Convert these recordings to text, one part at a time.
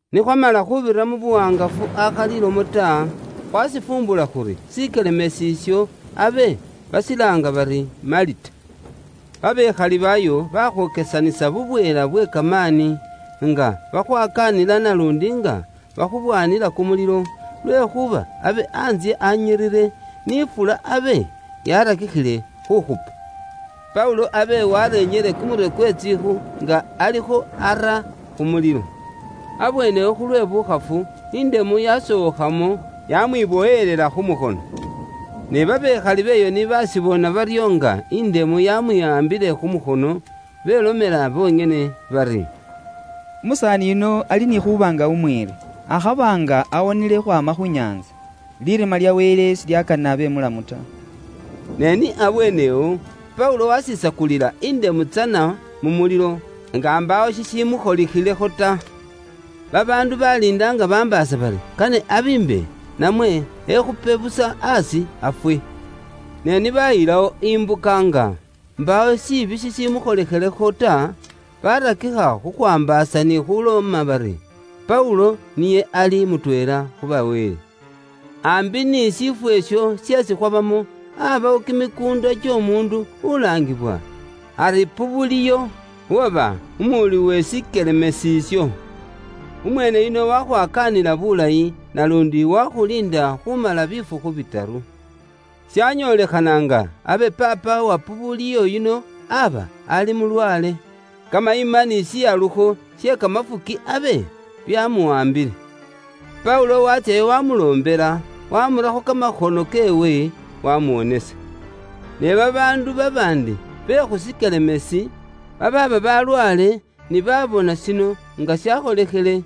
Ni khwamala khubira mu buwaangafu akhali ilomo ta, khwashifumbula khuri shikelemeesi isho abe bashilaanga bari Malita. Banaambo beeyo bakhwokesanisa bubweela bwe kamaani, nga bakhwakaanila naluundi nga bakhubwamila kumulilo, lwekhuuba abe antsye anyiriire, ni ifula abe yaarakikhile khuukhupa. Paulo abe waarenyile kumurwe kwe tsiikhu nga alikho ara khu mulilo. Abweene awo khulwe buukhafu, indemu yasookhamo, yaamwibowelela khu mukhono. Ne banaambo b'eyo ni baashibona baryo nga indemu yaamwiwaambile khu mukhono, belomela bonyene bari, “Umusaani yuno ali ni khuuba nga umwiiri, akhaba nga awonile khukhwaama khu nyaantsa, lirima lya wele silyakanile abe mulamu ta.” Ne ni abweene awo, Paulo wasisakulila indemu tsana mu mulilo, nga mbaawo shishimukholikhilekho ta. Babaandu baliinda nga bambaasa bari kane abiimbe namwe ekhupe busa aasi afwe. Ne ni bayilawo imbuka nga mbaawo shiibi shishimukholikhilekho ta, barakikha khukhwaambaasa ni khuloma bari Paulo niye ali mutweela khu ba wele. Ambi ni shifwo isho sheesi khwabamo, abawo kimikuunda ky'omuundu ulaangiwa ari Pubuliyo, uwaba umuwuli we shikelemeesi isho. Umweene yuno wakhwakaanila bulayi naluundi wakhuliinda khumala bifukhu bitaru. Shanyolekhana nga abe paapa wa Pubuliyo yuno aba ali mulwaale, kamayima ni shihalukho she kamafuki abe byamuwaambile. Paulo watsyayo wamuloombela, wamurakho kamakhono keewe, wamuwonisa. Ne babaandu babaandi be khu shikelemeesi babaaba balwaale ni baabona shino nga shakholikhile,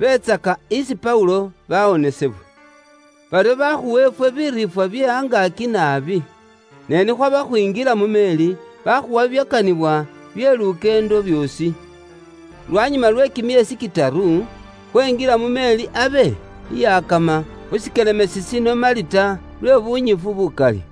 beetsaka isi Paulo bawonisibwa. Baryo bakhuwa ifwe biriifwa bye angaaki naabi. Ne ni khwaba khwinjila mu meeri, bakhuwa bibyakanibwa bye lukyeendo byoosi. Lwanyuma lwe kimyeesi kitaru, khwenjila mu meeri abe iyakama khu shikelemeesi shino Malita lwe bunyifu bukali.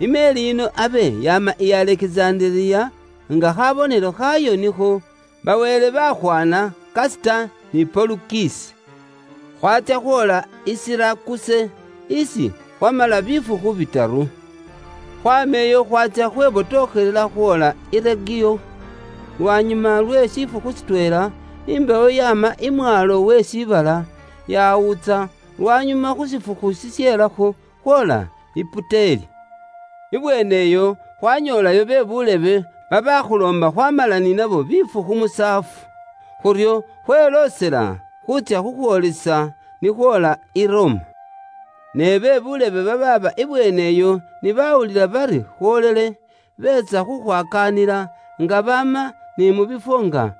I meeri yino abe yaama i Alekizandereya nga khabonelo khaayo nikho, “Ba wele bakhwana Kasita ni Polukisi.” Khwatsya khwoola i Sirakuse, isi khwamala bifukhu bitaru. Khwaama iyo khwaatsya khwebotokhelela khwoola i Regiyo. Lwanyuma lwe shifukhu shitweela, imbewo yaama i mwaalo we shiibala, yawuutsa, lwanyuma khu shifukhu shishelakho khwoola i Puteli Ibweene iyo khwanyoolayo be buulebe, babaakhuloomba khwaamala ni nabo bifukhu musaafu. Khuryo khweloosela khuutsya khukhwoolisa ni khwoola i Roma. Ne be buulebe babaaba ibweene iyo ni bawulila bari khwoolile, beetsa khukhwakaanila, nga baama ni mu bifwo nga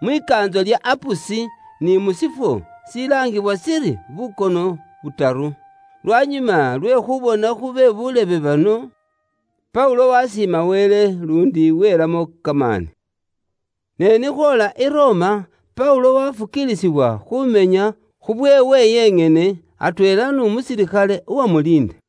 Mwikaantso lya Apusi ni mu shifwo shilaangibwa shiri Bukono Butaru. Lwanyuma lwe khubona khu be buulebe bano, Paulo wasiima Wele luundi welamo kamaani. Ne ni khwoola i Roma, Paulo wafukiilisibwa khumenya khubweewe yenyene, atweela n'umusilikhale uwamuliinda.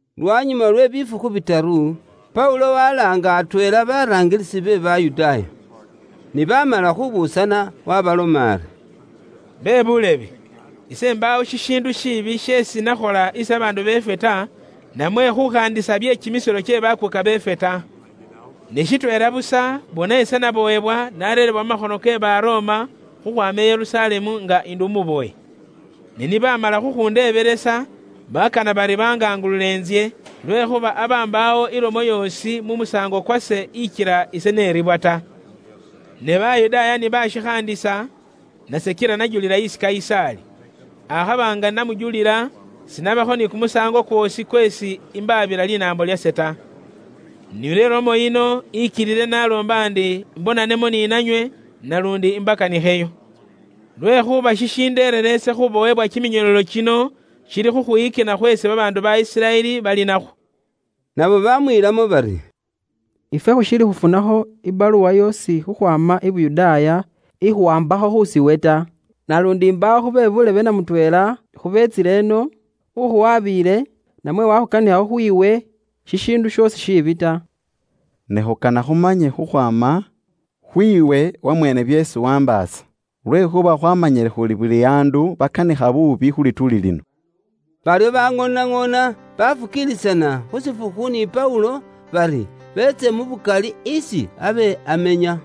Lwanyuma lwe bifukhu bitaru, Paulo walaanga atweela baraangilisi be Bayudaaya. Ni bamala khubuusana, waabaloma ari, “Bebuulebe, ise imbaawo shishiindu shiibi sheesi nakhola isi babaandu beefwe ta, namwe khukhaandisa bye kimisilo kye bakuuka beefwe ta. Ne shitweela busa bona ise nabowebwa nareerebwa mu makhono ke Baroma khukhwaama i Yerusalemu nga ndi umubowe. Ne ni baamala khukhundeebelesa, bakana bari bangangulule intsye, lwekhuuba aba mbaawo ilomo yoosi mu musaango kwase ikila ise neribwa ta. Ne Bayudaaya ni bashikhaandisa, nase kila najulila isi Kayisaali. Akhaba nga namujulila, sinabakho ni kumusaango kwoosi kweesi imbaabila linaambo lyase ta. Nilwe lomo yino ikilile naloomba ndi imbonanemo ni nanywe, naluundi imbakanikheyo. Lwekhuuba shishindeerera ise khubowebwa kiminyololo kino shili khukhwiyikina khweesi babaandu ba Isiraeli bali nakhwo.” Nabo bamwiilamo bari, “Ifwe khushiili khufunakho ibaluwa yoosi khukhwaama i Yuda ikhuwaambakho khusiiwe ta. Naluundi mbaawo khu be buulebe namutweela khubeetsile ino, ukhuwabiile, namwe wakhukanikhakho khwiiwe shishiindu shoosi shiibi ta. Ne khukana khumanye khukhwaama khwiiwe wamweene byeesi waambaasa. Lwekhuuba khwaamanyile khuri buli andu bakanikha buubi khu lituuli lino.” Baryo baŋoonaŋoona bafukiilisana khu shifukhu ni Paulo, bari beetse mu bukali isi abe amenya.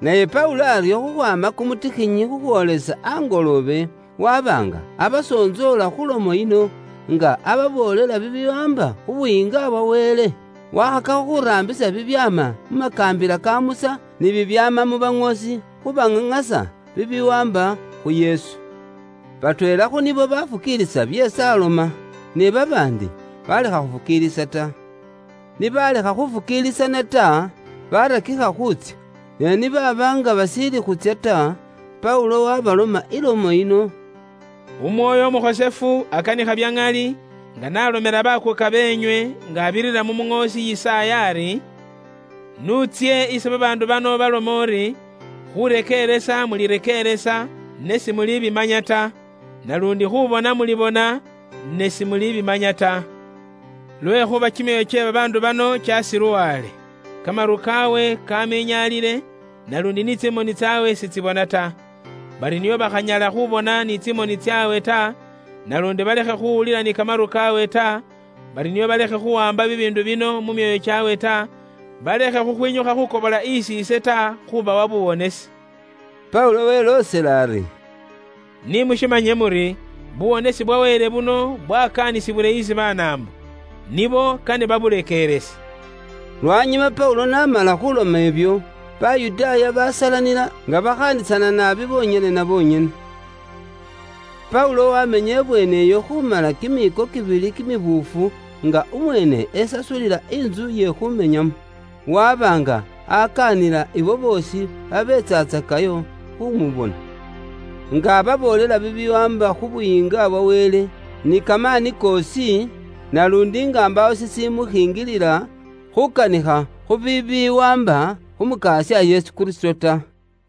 Naye Paulo aryo khukhwaama kumutikhinyi khukhwoolisa angoloobe, waba nga abasontsoola khu lomo yino, nga ababoolela bibiwaamba khu Buyiinga bwa Wele. Wakhakakho khuraambisa bibyaama mu makaambila ka Musa, ni bibyaama mu baŋoosi khubaŋaŋasa bibiwaamba khu Yesu. Batweela khu nibo bafukiilisa byeesi aloma, ne babaandi balekha khufukiilisa ta. Ni balekha khufukiilisana ta, barakikha khuutsya. Ne ni baaba nga bashiili khuutsya ta, Paulo waabaloma ilomo yino: “Umwoyo Umukhosefu akanikha bya ŋali nga n'alomela bakuuka beenywe nga abirira mu muŋoosi Yisaaya ari, ‘N'utsye isi babaandu bano ubalome uri, Khurekeeresa mulirekeeresa, ne simulibimanya ta; naluundi khubona mulibona, ne simulibimanya ta.’ ‘Lwekhuuba kimyoyo kye babaandu bano kyasiluwale. Kamaru kaawe kaminyaalile, naluundi ni tsimoni tsaabwe sitsibona ta. Bari nio bakhanyala khubona ni tsimoni tsaabwe ta, naluundi balekhe khuwulila ni kamaru kaawe ta bari nio balekhe khuwaamba bibiindu bino mu myoyo kyaabwe ta, balekhe khwinyukha khukobola isi ise ta khubawa buwonesi.’” Paulo weloosela ari, “Ni mushimanye muri buwonesi bwa Wele buno bwakaanisibwile isi Banaambo. Nibo kane baburekeerese.” Lwanyuma Paulo n'amala khuloma ibyo, Bayudaaya basalanila, nga bakhaandisana naabi bonyene na bonyene. Paulo wamenya ibweene iyo khumala kimiiko kibili kimibuufu nga umweene esasulila intsu iye khumenyamo. Waba nga akaanila ibo boosi babeetsatsakayo khumubona. Nga ababoolela bibiwaamba khu Buyiinga bwa Wele ni kamaani koosi naluundi nga mbaawo shishimushinjilila, khukanikha khu bibiwaamba khu Mukasya Yesu Kristo ta.